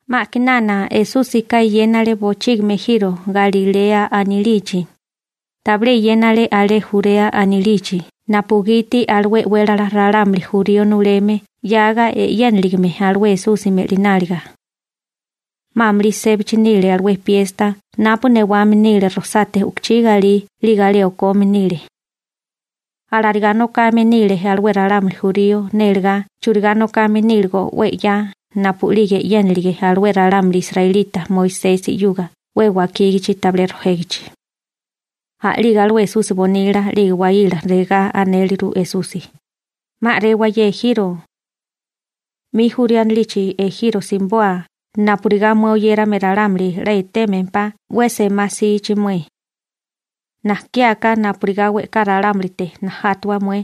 'Ma a'kinana Esúsika eyénale bochígimi ejiro Galilea anilichi. Tabilé eyénale alé Jurea anilichi napugiti alué e'wélala ralámuli jurío nuleme 'yaga e'yéniligime alué Esusi me'lináliga. 'Ma amulí sébachi nile alué piesta napu newame nile rojsate u'kuchí galí 'lige alé okome nile. (Alarigá nokame nile alué ralámuli jurío nélegá churigá nokame níligo 'we 'ya napu'lige e'yénilige alué ralámuli israelita Moisesi 'yuga 'we wakígachi tabilé rojégichi.) A'lige alué Esusi nasípasi bonila 'lige nasípasi waíla regá anéleru Esusi: ―'Ma a'rewa ye ejiro Galilea, 'mi Jurea anilichi ejiro simiboa napurigá mué oyérame ralámuli 'la etémempá 'we semá 'sichi mué. Najkiáká napurigá we'ká ralámulite najátawa mué,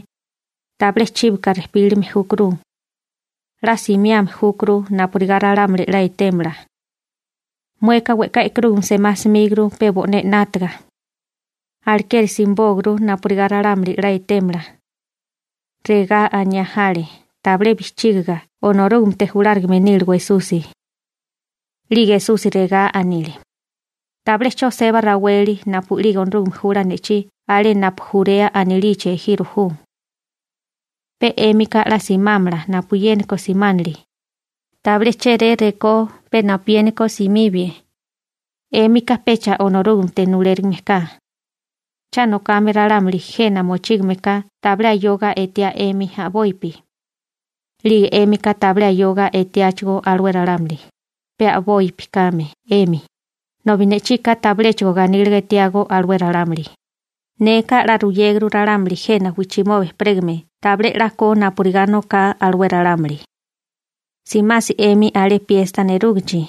tabilé chíbaka rejpílime júkuru. 'La simiame júkuru napurigá ralámuli 'la etémala. Mueka we'ká e'karúgame semá 'smíguru pe bo'né 'nátaga. Alekeri simibóaguru napurigá ralámuli 'la etémala. Regá aniá jale, tabilé bijchígiga Onorúgamete julárigame níligo Esusi. 'Lige Esusi regá anile: ―Tabilé 'cho seba raweli napu'lige Onorúgame jula ne'chí alé napu Jurea anilichi ejiro ju. Pe 'émika 'la simámala napuyéniko simánili. Tabilé chéré rekó pe napuyéniko simibie, 'émika pecha Onorúgamete nulérigime ka. Cha nokame ralámuli jena mochígame ka tabilé ayoga etiá 'emi a'bopi. 'Lige 'émika tabilé ayoga etiáchigó alué ralámuli, pe a'bopi kame 'emi, nobi ne'chika tabiléchigo ganíliga etiágó alué ralámuli. Neka 'la ruyéguru ralámuli jena wijchimoba ejperégame tabilé 'la ko napurigá noká alué ralámuli. Simasi 'emi alé piesta nerúgichi.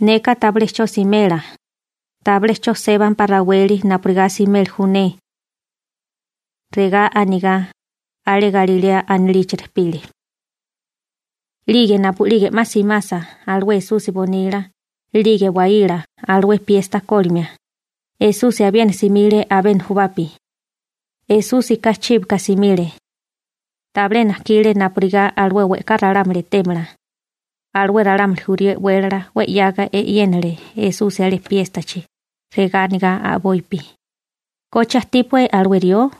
Neka tabilé 'cho simela, tabilé 'cho sébampá raweli napurigá simeli ju ne. Regá anigá, alé Galilea anilichi rejpile. 'Lige napu'lige 'ma simasa alué Esusi nasípasi bonila 'lige nasípasi waíla alué piesta kólimia, Esusi abiena simile abé nujubapi. Esúsika chíbika simile. Tabilé najkile napurigá alué we'ká ralámuli etémala. Alué ralámuli jurío e'wélala 'we 'yaga e'yénale Esusi alé piéstachi, regá anigá a'bopi: ―¿Koche ajtípué alué rió?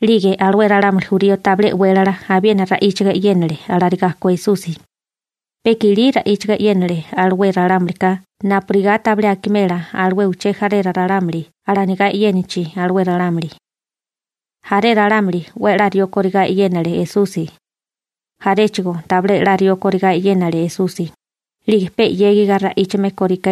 'Lige alué ralámuli jurío tabilé e'wélala abiena ra'íchiga e'yénale alarigá ko Esusi, pe i'kilí ra'íchaga e'yénale alué ralámulika napurigá tabilé akimela alué uché jaré ralámuli alanigá e'yénachi alué ralámuli. Jaré ralámuli 'we a'lá rió kóríle Esusi. Jaréchigo tabilé 'la rió kóríle Esusi, 'lige pe 'yégiga ra'íchame kóríle.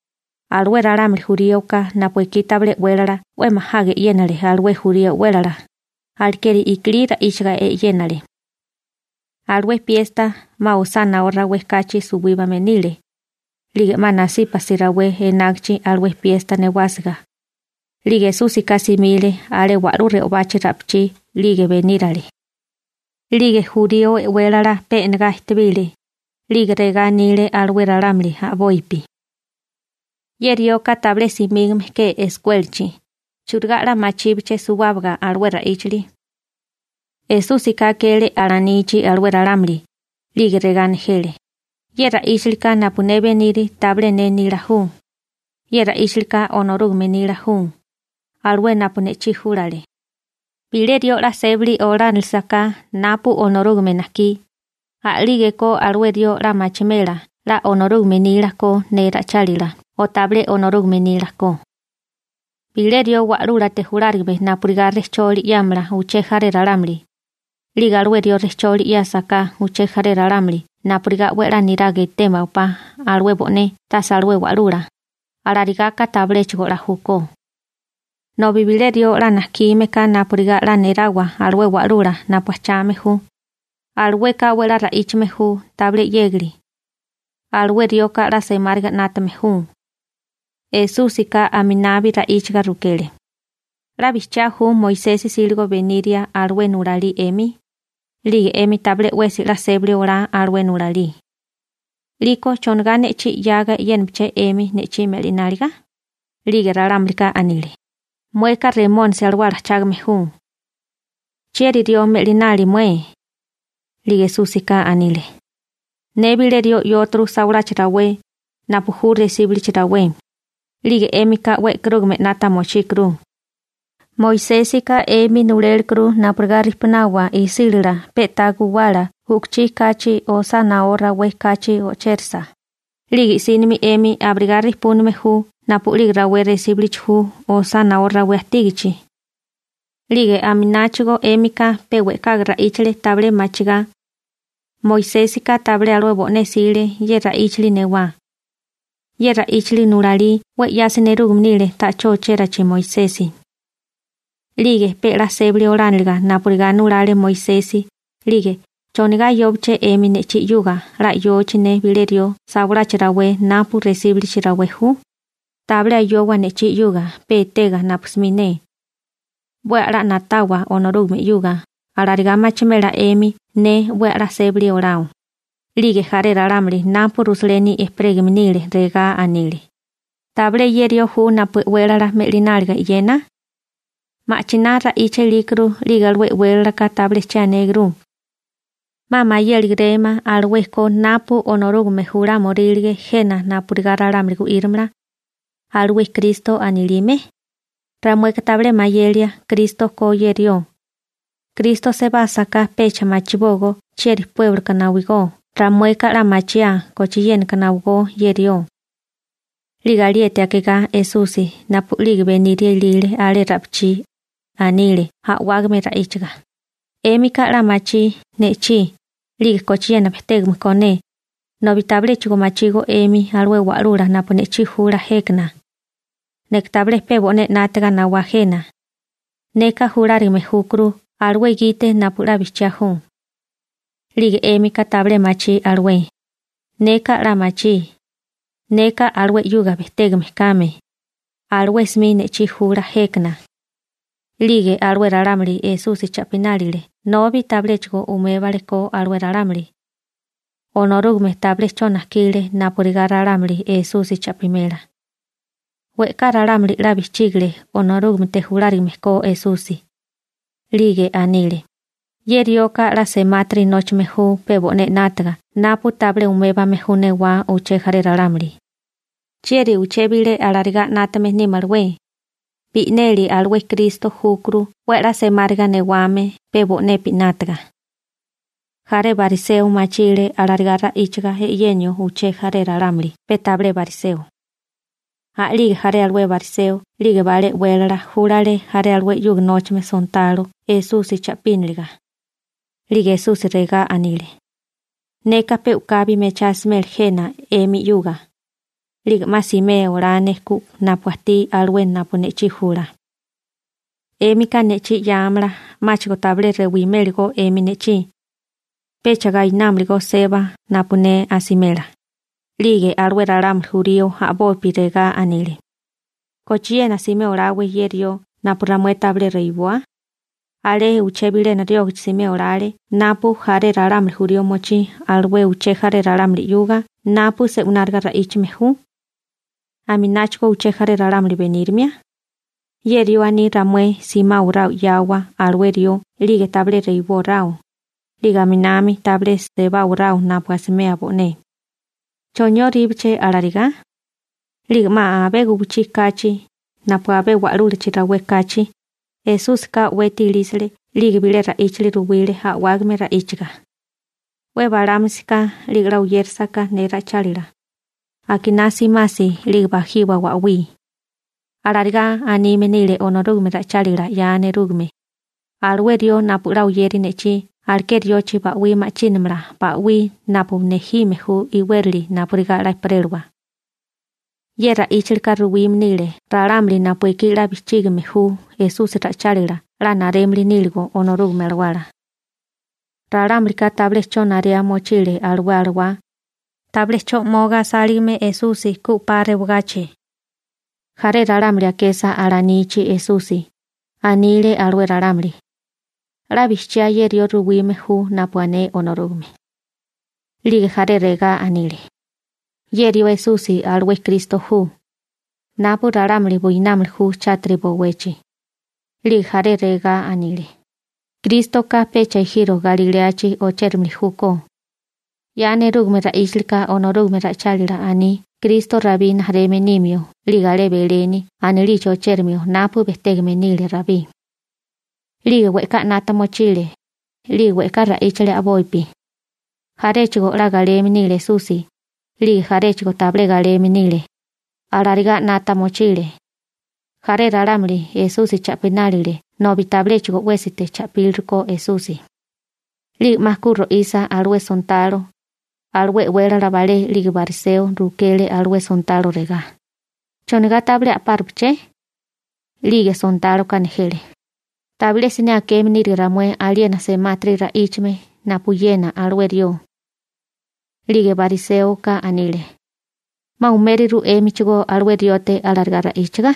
Alué ralámuli juríoka napu ekí tabilé e'wélala 'we majaga e'yénale alué jurío e'wélala, alekeri i'kilí ra'íchiga e'yénale. Alué piesta 'ma osá no rawé kachi suwíbame nile, 'lige 'ma nasípasi rawé enágichi alué piesta newásiga, 'lige Esúsika simile alé wa'lú re'obachi ra'pichí 'lige benírale. 'Lige jurío e'wélala pe e'negá ejtebile, 'lige regá anile alué ralámuli a'bopi: ―Ye rioka tabilé simígame ke eskuélachi. ¿Churigá 'la machíbeché suwábaga alué ra'íchali? Esúsika akele alanichi alué ralámuli, 'lige regá nejele: ―Ye ra'íchalika napu ne beniri tabilé ne nila ju. Ye ra'íchalika Onorúgame nila ju, alué napu ne'chí júlale. Bilé rió 'la sébali olánalisaká napu Onorúgame najkí, a'lígeko alué rió 'la machimela 'la Onorúgame nila ko ne ra'ichálila o tabilé Onorúgame nila ko. Bilé rió wa'lúlate julárigame napurigá rejcholi ruyémala uché jaré ralámuli, 'lige alué rió rejcholi ruyésaká uché jaré ralámuli napurigá 'we a'lá niraga etewa alué bo'né tase alué wa'lula, alarigá ka tabiléchigo 'la júkó. Nobi bilé rió 'la najkime ka napurigá 'la nerawa alué wa'lula napu ajchame ju, alueka 'we a'lá ra'íchame ju tabilé 'yégali. Alué rioka 'la semáriga 'nátame ju. Esúsika aminabi ra'íchiga rukele: ―¿'La bijchiá ju Moisesi 'síligo beniria alué nulalí 'emi? 'Lige 'emi tabilé 'wesi 'la sébali olá alué nulalí. 'Liko ¿chonigá ne'chí 'yaga e'yénaché 'emi ne'chí me'lináliga? 'Lige ralámulika anile: ―Mueka Remónisi alawala ajchágame ju. ¿Chieri rió me'linali mué? 'Lige Esúsika anile: ―Ne bilé rió 'yóturu sawalachi rawé, napu ju resíbalichi rawé, 'lige 'émika 'we e'karúgame 'nata mochíkuru. Moisésika 'emi nulélekuru napurigá rijpunawa isílala pe'tá guwala wi'chila u'kuchí kachi osá naó rawé kachi ochérisa, 'lige i'sínimi 'emi abirigá rijpúname ju napu'lige rawé resíbulichi ju osá naó rawé ajtígachi. ('Lige aminámichigó 'émika pe we'kaga ra'íchale tabilé machigá. Moisésika tabilé alué bo'né 'sile ye ra'íchali newá. Ye ra'íchali nulalí 'we 'yasi nerúgame nile ta'chó ochérachi Moisesi.) 'Lige pe 'la sébali olániliga napurigá nulale Moisesi, 'lige ¿chonigá ayóbeché 'emi ne'chí 'yuga 'la 'yochi ne bilé rió sawalachi rawé napu resíbulichi ju? Tabilé ayowa ne'chí 'yuga pe etega napu 'smi ne. 'We a'lá na'tawa Onorúgame 'yuga. Alarigá machimela 'emi ne 'we a'lá sébali olao. 'Lige jaré ralámuli napu Rusaleni ejperégame nile regá anile: ―¿Tabilé ye rió ju napu e'wélala me'lináliga e'yena? Ma'chiná ra'icha ilíkuru 'lige alué e'wélalaka tabilé che anégurú. ¿'Ma mayéligirémá alué ko napu Onorúgame julámorílige jena napurigá ralámuli gu'írimala, alué Kristo anilime? Ramueka tabilé mayelia Kristo ko ye rió. Kristo sebásaká pecha machibógó chieri puébloka nawigó. Ramueka 'la machiaa kochiénaka nawigó ye rió. 'Lige alieti akigá Esusi napu'lige beniria ilile alé ra'pichí, anile a'wágame ra'íchaga: ―'Émika 'la machí ne'chí, 'lige kochiena bejtégame ko ne, nobi tabiléchigo machígó 'emi alué wa'lula napu ne'chí jula jékana. Neka tabilé pe bo'né 'nátaga nawá jena. Neka julárigame júkuru alué gite napu 'la bijchiá ju. 'Lige 'émika tabilé machí alué. Neka 'la machí, neka alué 'yuga bejtégame kame. Alué 'smi ne'chí jula jékana. 'Lige alué ralámuli Esusi cha'pinánile nobi tabiléchigo umébale ko alué ralámuli. Onorúgame tabilé 'cho najkile napurigá ralámuli Esusi cha'pimela. We'ká ralámuli 'la bijchígile Onorúgamete julárigame ko Esusi, 'lige anile: ―Ye rioka 'la semátiri nóchame ju pe bo'né 'nátaga napu tabilé umébame ju newá uché jaré ralámuli. ¿Chieri uché bilé arigá 'nátame nímalawé? Bi'neli alué Kristo júkuru 'we a'lá semáriga newame pe bo'nepi 'nátaga. Jaré bariseo machile alarigá ra'íchiga e'yenio uché jaré ralámuli pe tabilé bariseo. A'lige jaré alué bariseo 'lige balé e'wélala júlale jaré alué 'yuga nóchame sontalo Esusi cha'píniliga. 'Lige Esusi regá anile: ―Neka pe u'kabi mechá asimela jena 'emi 'yuga, 'lige 'ma simea olá ne ku napu ajtí alué napu ne'chí jula. 'Émika ne'chí 'yáamala, 'máchigo tabilé rewimélagó 'emi ne'chí. Pecha gainámalagó seba napu ne asimela. 'Lige alué ralámuli jurío a'bopi regá anile: ―¿Kochiena simé oláwé ye rió napu ramué tabilé rewiboa? ¿Alé uché bilena riógachi simé olale napu jaré ralámuli jurío mochí alué uché jaré ralámuli 'yuga napu se'wináriga ra'íchame ju, amináchigo uché jaré ralámuli benírimia? Ye rió aní ramué simáwaráo 'yawa alué rió 'lige tabilé rewibóráo, 'lige aminami tabilé sebáwaráo napu asimeo bo'né. ¿Chonióríbeché alarigá? 'Lige 'ma abé guwichí kachi, napu abé wa'lúlachi rawé kachi, Esúsika o'weti ilísale 'lige bilé ra'íchali ruwile a'wágame ra'íchiga: ―'We balámisiká 'lige 'la oyérasaká ne ra'ichálila, akiná simasi 'lige bajiwa ba'wí. Alarigá anime nile Onorúgame ra'ichálila 'ya nerúgame: «Alué rió napu 'la oyeri ne'chí aleké riochi ba'wí ma'chínamala ba'wí napu nejime ju iwérali napurigá 'la ejperélawa.» Ye ra'íchali ka ruwime nile ralámuli napu ekí 'la bijchígime ju Esusi ra'ichálila 'la narémili níligo Onorúgame Alawala. Ralámulika tabilé 'cho narea mochile alué Alawá, tabilé 'cho 'moga asáligame Esusi ku 'pa rewagachi. Jaré ralámuli akesa alanichi Esusi, anile alué ralámuli: ―'La bijchiá ye rió ruwime ju napu ané Onorúgame. 'Lige jaré regá anile: ―Ye rió Esusi alué Kristo ju, napu ralámuli buinámili ju chátiri bowechi. 'Lige jaré regá anile: ―Krístoka pecha ejiro Galiléachi ochérimili júkó. 'Ya nerúgame ra'íchalika Onorúgame ra'ichálila aní Kristo Rabí rijimala nimio 'lige alé Beleni anilichi ochérimio napu bejtégame nile Rabí. 'Lige we'ká 'nata mochile, 'lige we'ká ra'íchale a'bopi. Jaréchigo 'la galeme nile Esusi, 'lige jaréchigo tabilé galeme nile. Alarigá 'nata mochile. Jaré ralámuli Esusi cha'pinánile nobi tabiléchigo 'wésite cha'píliriko Esusi. 'Lige 'ma ku ro'isa alué sontalo, alué e'wélala balé 'lige bariseo rukele alué sontalo regá: ―¿Chonigá tabilé a'párupaché? 'Lige sontáloka nejele: ―Tabilé siné akeme nírige ramué aliena semátiri ra'íchame napuyena alué rió. 'Lige bariséoka anile: ―¿'Ma umériru 'émichigó alué riote alarigá ra'íchiga?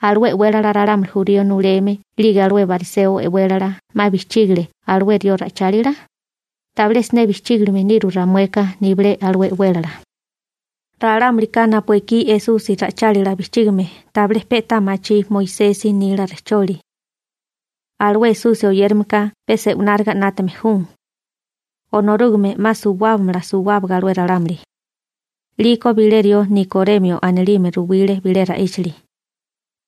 ¿Alué e'wélala ralámuli jurío nuleme 'lige alué bariseo e'wélala 'ma bijchígile alué rió ra'ichálila? Tabilé siné bijchígilime niru ramueka nibilé alué e'wélala. Ralámulika napu ekí Esusi ra'ichálila bijchígame tabilé pe'tá machí Moisesi nila rejcholi. Alué Esusi oyérameka pe se'wináriga 'nátame ju. Onorúgame 'ma suwábamala suwábaga alué ralámuli. 'Liko bilé rió Nikoremio anilime ruwile bilé ra'íchali.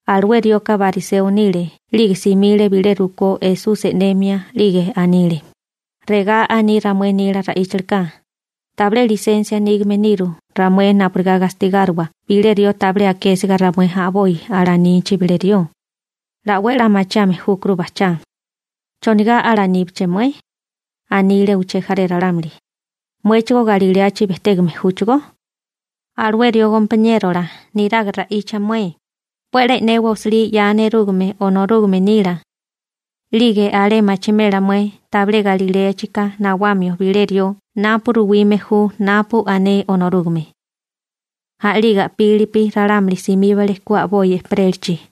Alué rioka bariseo nile 'lige simile bilé rukó Esusi e'nemia 'Lige anile: ―Regá aní ramué nila ra'íchalika: tabilé lisensia nígame niru ramué napurigá gastigáriwa bilé rió tabilé akésiga ramué a'boi alanichi bilé rió. 'La 'we a'lá machiame júkuru bajchá. ―¿Chonigá alaníbiché mué? ―anile uché jaré ralámuli―. ¿Muéchigó Galilea bejtégame júchigó? ¿Alué rió gompaniérola niraga ra'icha mué? 'We a'lá e'newa osilí 'ya nerúgame Onorúgame nila. 'Lige alé machimela mué tabilé Galiléaka nawamio bilé rió napu ruwime ju napu ané Onorúgame. A'lige a'pílipi ralámuli simíbale ku a'boi ejperélachi.